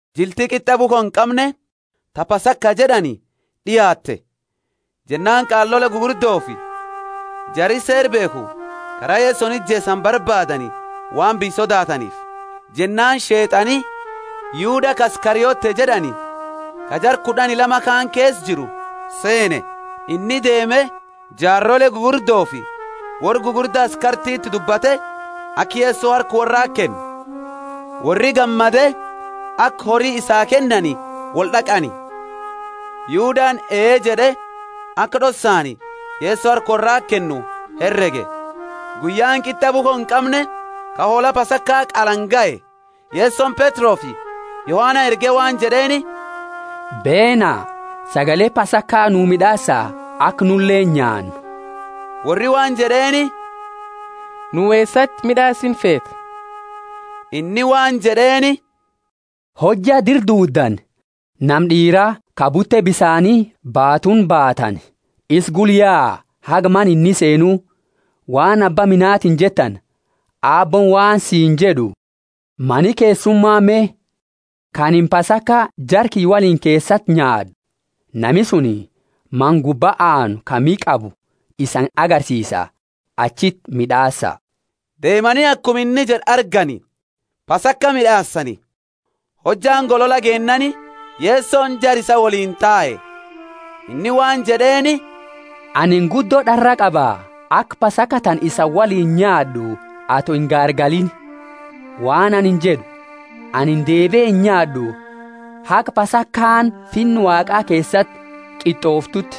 Jilti Qit'a bukho inqamne, ta Pasaka jed'ani, d'iaate. Jennaani qaalole gugurdofi jari Seera beekhu kara Yesoni ijeesani barbaadani, waan biyya sodaataniifi. Jennaani Sheet'ani Yuda ka Iskariote jed'ani, ka jara kud'ani lama kaani keesa jiru, seene. Inni deeme, jaarole gugurdofi worra gugurda askartiti dubbate aka Yeso harka worrati kennu. Worri gammade, aka hori isaa kennani wold'aqani. Yudani, Ee jed'e, aka d'ossaani Yeso harka worrati kennu herege. Guyyaani Qit'a bukho inqamne, ka hoola Pasaka qalani, gahe. Yesoni Petrofi Yohana erge waan jed'eeni, Beena, sagale Pasaka nu mid'aasa aka nuleeni nyaannu. Worri waan jed'eeni, Nu eesati mid'aasinu feeta? Inni waan jed'eeni, Hojja dira duuddani nama d'iira ka bute bisaani baatuuni baatani, isa gula yaa, haga mana inni seenu. Waan abba manatiini jettani, Aabbooni waan siini jed'u, Mani keessuma me, ka anini Pasaka jara kiyya woliini keesati nyaad'u? Nami suni mana gubba aanu ka miha qabu isani agarsiisa, achiti mid'aasa. Deemani akuma inni jed'e argani, Pasaka mid'aasani. Hojjaani golola geennaani, Yesoni jara isaa woliini tae. Inni waan jed'eeni, Anini guddo d'arraa qaba, aka Pasaka tana isani woliini nyaad'u, ato ingaargaliini. Waan anini jed'u, anini deebie inyaad'u haga Pasakaani Finna Waaqa keesati qit'ooftuuti.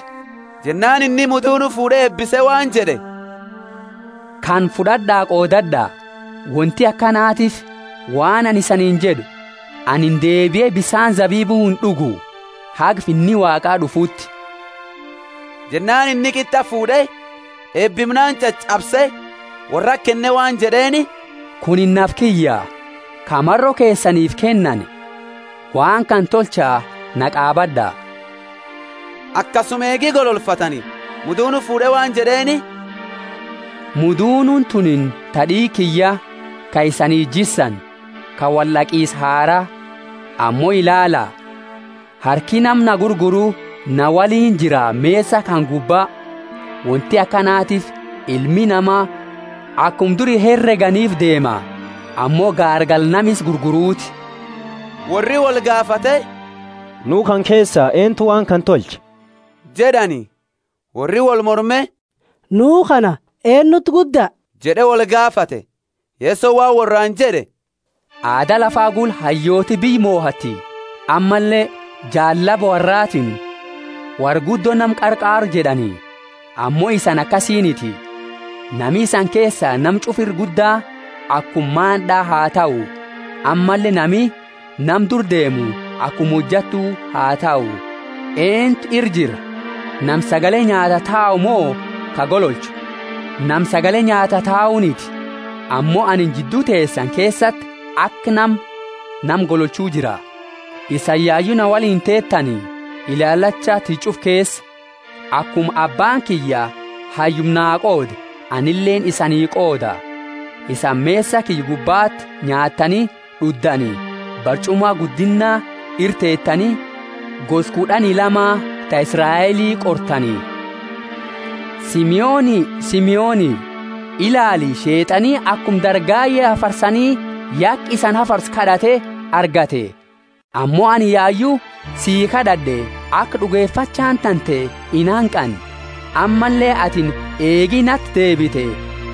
Jennaani inni mudunu fuud'e eebise waan jed'e, Kana fud'ad'a qoodad'a; wonti akanatiifi waan anini isaniini jed'u, Anini deebie bisaani zabibu, ind'ugu, haga Finni Waaqa d'ufuuti. Jennaani inni qit'a fuud'e, eebimnaani ch'ach'abse, worrati kenne waan jed'eeni, Kunini nafa kiyya [ka maro keesaniifi kennani. Waan kana tolcha na qaabad'a. Akasuma eegi gololfatani mudunu fuud'e waan jed'eeni, Mudunuuni tunini ta d'iiga kiyya, ka isanii jissani, ka wold'aqisa haraa.] Ammo ilaala! Harki nama na gurguru ana woliini jira mesa kana gubba! Wonti akanatiifi Ilmi Nama akuma duri hereganiifi deema; ammo gaargala nama isa gurguruti. Worri wolgaafate, Nu kana keesa eentu waan kana tolcha? jed'ani. Worri wolmorme, Nu kana eennuti gudda? jed'e wolgaafate. Yesoni waan worraani jed'e, Aada lafa gula, hayyooti biyya mohatti, ammalle jaallaba worraatiini, Worra guddo nama qarqaaru jed'ani. Ammo isani akasiiniti; nami isani keesa nama ch'ufa ira gudda akuma maand'a ha tahu, ammalle nami nama dura deemu akuma hojattu ha tahu. Eentu ira jira, nami sagale nyaataa tau mo ka gololchu? Nami sagale nyaataa tauniti? Ammo anini jiddu teesani keesati aka nama nama gololchu jira. Isani yayu na woliini teetani ilaalacha tiyya ch'ufa keesa. Akuma abbaani kiyya hayyuma naa qoode, anileeni isanii qooda. Isani mesa kiyya gubbati nyaattani d'uddani, barch'uma guddinna ira teetani gosa kud'ani lama ta Israeli qortani. Simoni, Simoni, ilaali, Sheet'ani, akuma dargaye hafarsani ya aka isani hafarsu kad'ate argate. Ammo anini yayu sii kad'ad'e aka d'ugefachaani tante inhanqanne. Ammalle atini eegi nati deebite,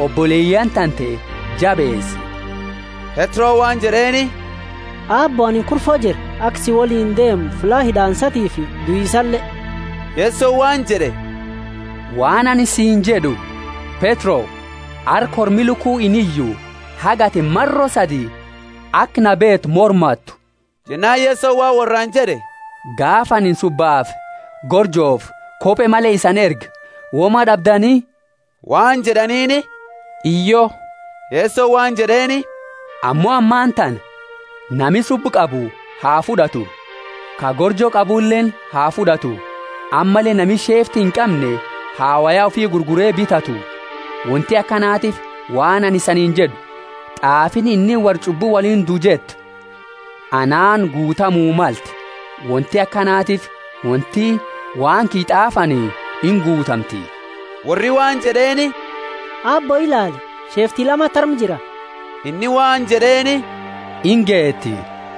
oboleyaani tante jabeesi. Petroni waan jed'eeni, Aabbo, anini kurfo jira aka si woliini deemu fulla hid'aansatiifi duisale. Yesoni waan jed'e, Waan anini siini jed'u, Petro, arra kormi luku iniyu, haga atini maro sadi aka na beetu mormatu. Jennaani Yeso waan worraani jed'e, Gaafa anini subbafi gorjofi kope male isani erge woma d'abdani? Waan jed'aniini, Hiyyo. Yesoni waan jed'eeni, Ammo ammatana, nami subba qabu ha fud'atu, ka gorjo qabuleeni ha fud'atu; ammalle nami sheefti inqamne ha woya ufi gurgure bitatu. Wonti akanatiifi, waan anini isaniini jed'u, T'aafiini inni worra ch'ubbu woliini dua jettu, anaani guutamu malte. Wonti akanatiifi wonti waan kiyya t'aafani inguutamti. Worri waan jed'eeni, Aabbo, ilaali, sheefti lamati arma jira! Inni waan jed'eeni, Ingeeti.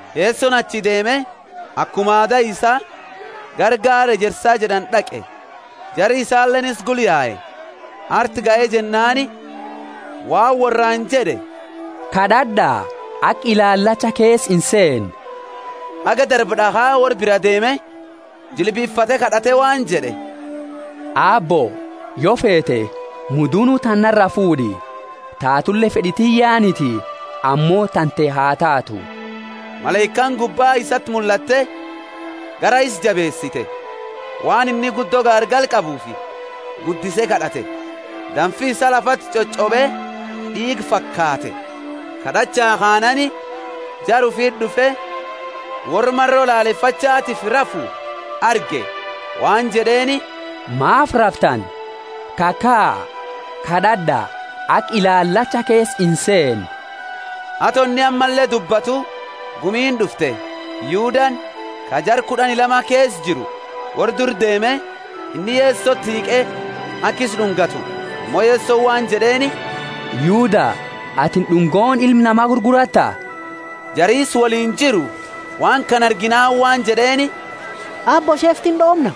Yesoni achii deeme, akuma aada isaa gara Gaara Ejersa jed'ani d'aqe; jari isaleeni isa gula yae. Arti gahe jennaani waan worraani jed'e, Kad'ad'a aka ilaalacha keesa inseenne. Haga darba d'akha worra bira deeme, jilbifate kad'ate waan jed'e, Aabbo, yo feete, mudunu tana nara fuud'i; tatule fed'i tiyyaniti, ammo tante ha taatu. [ Malaikaani gubba isati mullatte garaa isaa jabeesite. Waan inni guddo gaargala qabuufi guddise kad'ate; damfi isaa lafati ch'och'obe d'iiga fakaate.] Kad'achaa kaanaani, jara ufiti d'ufe, worra maro lalefachatiifi rafu arge waan jed'eeni, Maafi raftani? Kakaa, kad'ad'a, aka ilaalacha keesa inseenne. Ato inni ammalle dubbatu gumiini d'ufte; Yudani, ka jara kud'ani lama keesa jiru, worra dura deeme. Inni Yesoti hiiqe aka isa d'ungatu. Ammo Yesoni waan jed'eeni, Yuda, atini d'ungooni Ilma Nama gurguratta? Jari isa woliini jiru waan kana arginaani waan jed'eeni, Aabbo, sheeftini d'oomna?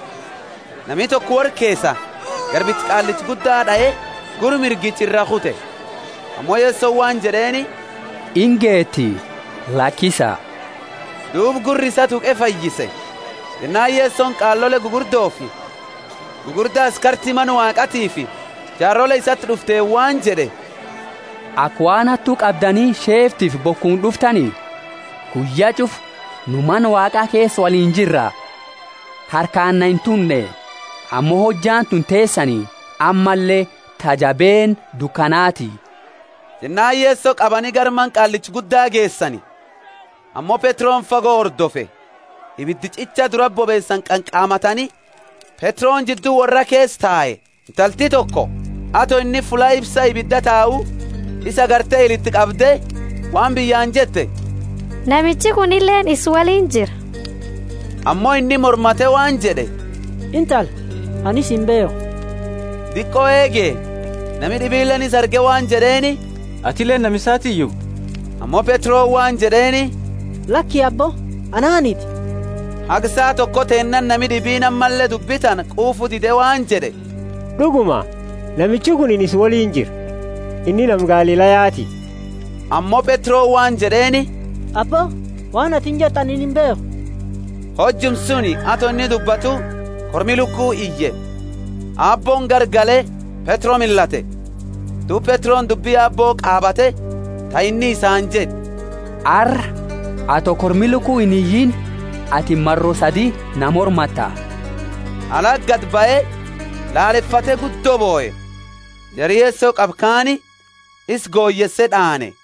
Nami toko worra keesa garbicha qaallicha gudda d'ae, gurra mirgicha iraa kute. Ammo Yesoni waan jed'eeni. Ingeeti! Lakisa! Duuba gurra isaa tuqe fayyise. Jennaani Yesoni qaalole gugurdofi gugurda askarti Mana Waaqatiifi jaarole isati d'ufteeni waan jed'e, Aka waan hattu qabdani sheeftifi bokuuni d'uftani? Guyya ch'ufa nu Mana Waaqa keesa woliini jirra, harkaani na intunne. Ammo hojjaani tuni teesani, ammalle ta jabeenna dukanaati. Jennaani Yeso qabani gara mana qaallicha gudda geesani, ammo Petroni fago hordofe. Ibida ch'icha durati bobeesani qanqamatani, Petroni jiddu worra keesa tae. Intalti toko, ato inni fulla ifsa ibida tau, isa agarte ila iti qabde waan biyyaani jette, Namichi kunileeni isa woliini jira. Ammo inni mormate waan jed'e, Intala, anini isa imbeekhu. Diqo eege, nami d'ibileeni isa arge waan jed'eeni, Atileeni nama isaatiiyu! Ammo Petroni waan jed'eeni, Laki, abbo, ananiti. Haga saa toko teennaani nami d'ibiini ammalle dubbi tana quufu dide waan jed'e, D'uguma namichi kuni isa woliini jira; inni nama Galilayati. Ammo Petroni waan jed'eeni, Abbo, waan atini jettu anini imbeekhu. Hojuma suni, ato inni dubbatu, kormi luku iye. Aabbooni garagale Petro millate; duuba Petroni dubbi Aabbo qaabate ta inni isaani jed'e, Arra, ato kormi luku iniyiini, atini maro sadi na mormatta. Alati gadi bahe laalefate guddo bohe. Jari Yeso qabe kaani isa goyeese d'aane.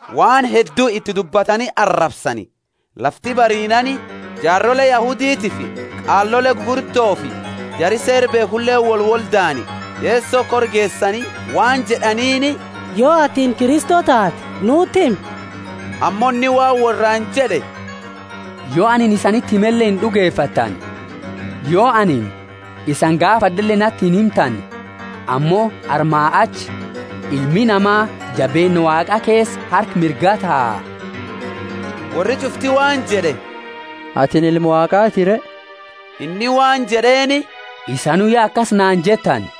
Waan, heddu iti dubbatani arabsani. Lafti bariinaani, jaarole Yahuditiifi qaalole gugurdofi jari Seera beekhuleeni wolwoldaani, Yeso kora geesani waan jed'aniini, Yo atini Kristo taate, nuti himi. Ammo inni waan worraani jed'e, Yo anini isaniti himele ind'ugefattani. Yo anini isani gaafad'ele nati inhimtani. Ammo armaa achi Ilmi Nama jabeenna Waaqa keesa harka mirgaa taa. Worri ch'ufti waan jed'e, Atini Ilma Waaqati re? Inni waan jed'eeni, Isanu ya akasi naani jettani.